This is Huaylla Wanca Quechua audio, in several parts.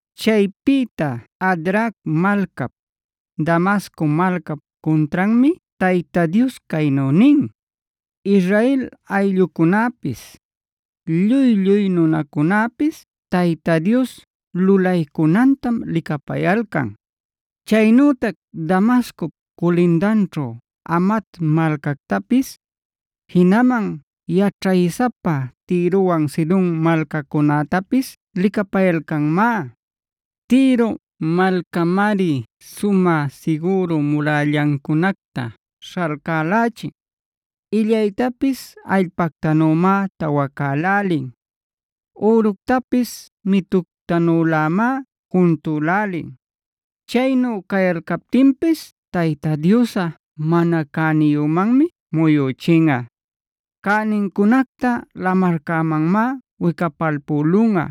Chaypïta Hadrac malcap, Damasco malcap cuntranmi Tayta Dios caynu nin: “Israel ayllucunäpis, lluy-lluy nunacunäpis Tayta Dios lulaycunantam licapayalcan. Chaynütac Damascop culindanćhu Hamat malcactapis, jinaman yaćhaysapa Tirowan Sidon malcacunätapis licapayalcanmá. Tiro malcamari sumä sigüru murällancunacta śhalcälächin, illaytapis allpactanümá tawacälälin, üructapis mituctanülämá juntucälälin. Chaynu cayalcaptinpis Tayta Diosꞌa mana cäniyümanmi muyüchinꞌa. Cänincunacta lamarcämanmá wicapalpülunꞌa.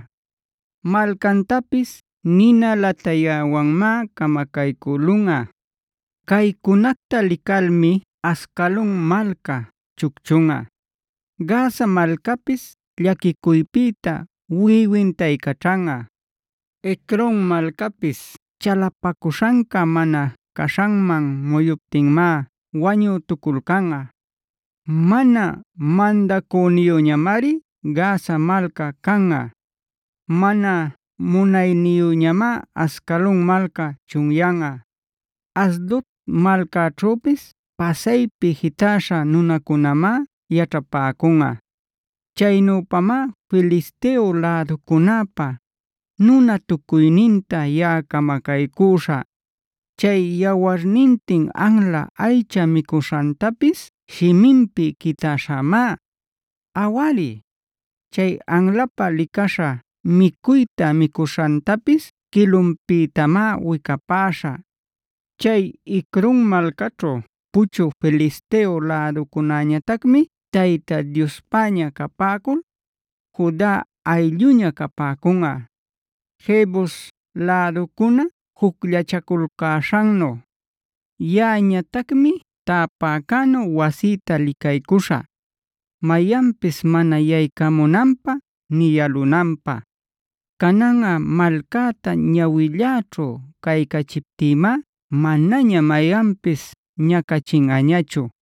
Malcantapis nina latayäwanmá camacaycülunꞌa. “Caycunacta licalmi Ascalon malca chucchunꞌa, Gaza malcapis llaquicuypïta wiꞌiwintaycaćhanꞌa; Ecron malcapis chalapacuśhanca mana caśhanman muyuptinmá wañütuculcanꞌa. Mana mandacüniyüñamari Gaza malca canꞌa. Mana nunayüñamá Ascalon malca chunyanꞌa. Asdod malcaćhüpis pasaypi jitäśha nunacunañamá yaćhapäcunꞌa. Chaynüpamá Filisteo läducunäpa nunatucuyninta yaꞌa camacaycüśhä. Chay yawarnintin anla aycha micuśhantapis shiminpi quitäśhämá. Awari, chay anlapä licaśha micuyta micuśhantapis quilunpïtamá wicapäśhä. Chay Ecron malcaćhu puchü Filisteo läducunäñatacmi Tayta Diospäña capäcul, Juda aylluña capäcunꞌa, Jebus läducuna jucllachaculcäśhannu. Yaꞌañatacmi täpäcänu wasïta licaycuśhä, mayanpis mana yaycamunanpä nï yalunanpä. Cananꞌa malcäta ñawilläćhu caycachiptïmá manaña mayanpis ñacachinꞌañachu.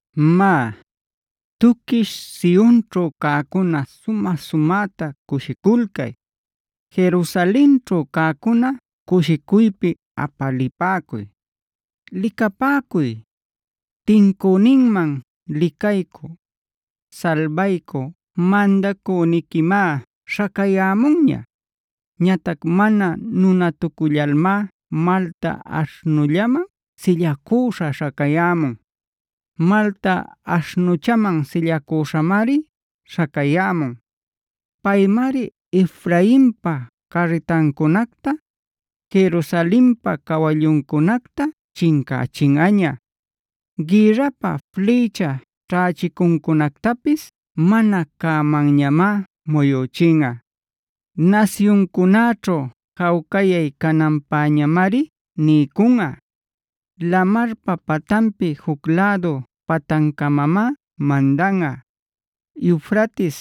“Má, ¡tuquish Sionćhu cäcuna sumä-sumäta cushiculcay! ¡Jerusalenćhu cäcuna cushicuypi apalipäcuy! Licapäcuy, tincüninman licaycü, salbaycü mandacüniquimá śhacayämunña. Ñatac mana nunatucullalmá malta aśhnullaman sillacüśha śhacayämun; malta aśhnuchaman sillacüśhamari śhacayämun. Paymari Efrainpa carritancunacta, Jerusalenpa cawalluncunacta chincächinꞌaña; gïrrapä flïcha ćhächicuncunactapis mana cämanñamá muyüchinꞌa. Nasyuncunäćhu jawcayay cananpäñamari niycunꞌa. Lamarpa patanpi juc lädu patancamamá mandanꞌa; Eufrates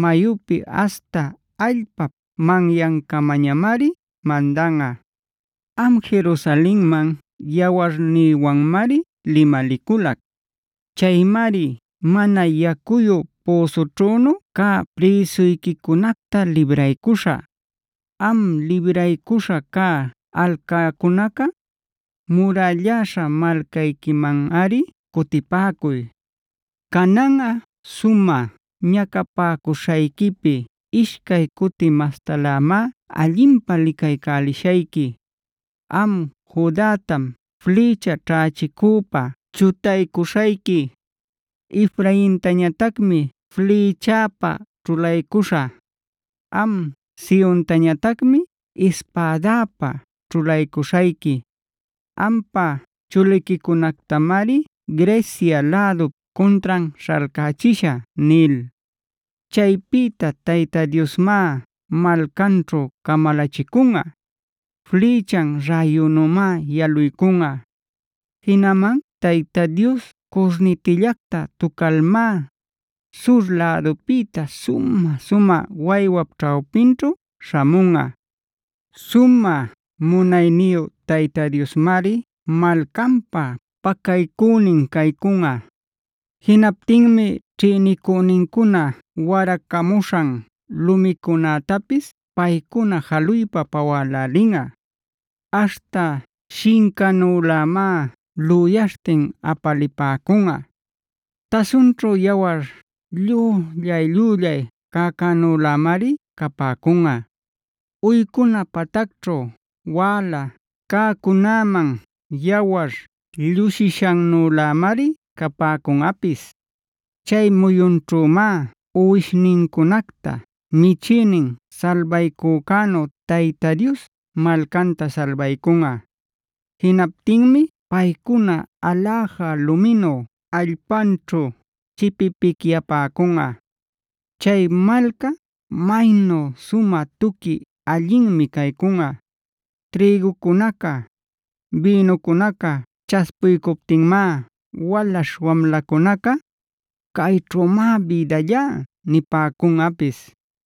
mayupi aśhta allpap manyancamañamari mandanꞌa. “Am Jerusalenman yawarnïwanmari limaliculac. Chaymari mana yacuyu püsućhünu cä prïsuyquicunacta libraycuśhä. Am libraycuśha cä alcäcunaca, murälläśha malcayquimanꞌari cutipäcuy. Cananꞌa sumä ñacapäcuśhayquipi ishcay cuti mastalämá allinpä licaycälishayqui. Am Judatam flïcha ćhächicüpä chutaycuśhayqui; Efraintañatacmi flïchäpä ćhulaycuśhä. Am Siontañatacmi ispädäpä ćhulaycuśhayqui; ampa chuliquicunactamari Grecia lädup cuntran śhalcachishä” nil. Chaypïta Tayta Diosmá malcanćhu camalachicunꞌa. Flïchan räyunümá yaluycunꞌa. Jinaman Tayta Dios curnitillacta tucalmá, sur lädupïta sumä-sumä waywap ćhawpinćhu śhamunꞌa. Sumä munayniyu Tayta Diosmari malcanpä pacaycünin caycunꞌa. Jinaptinmi ćhïnicünincuna waracamuśhan lumicunätapis paycuna jaluypa pawälälinꞌa. Aśhta shincanülämá lüyaśhtin apalipäcunꞌa; tasunćhu yawar llüllay-llüllay cäcänülämari capäcunꞌa; uycuna patacćhu wäla cäcunäman yawar llusïshannülämari capäcunꞌapis. Chay muyunćhümá uwishnincunacta michïnin salbaycücänu Tayta Dios malcanta salbaycunꞌa. Jinaptinmi paycuna aläja luminu allpanćhu chipipicyapäcunꞌa. Chay malca, maynu sumä tuqui allinmi caycunꞌa. Trïgucunaca, bïnucunaca chaspuycuptinmá walaśh wamlacunaca: “Cayćhümá bïdallá” nipäcunꞌapis.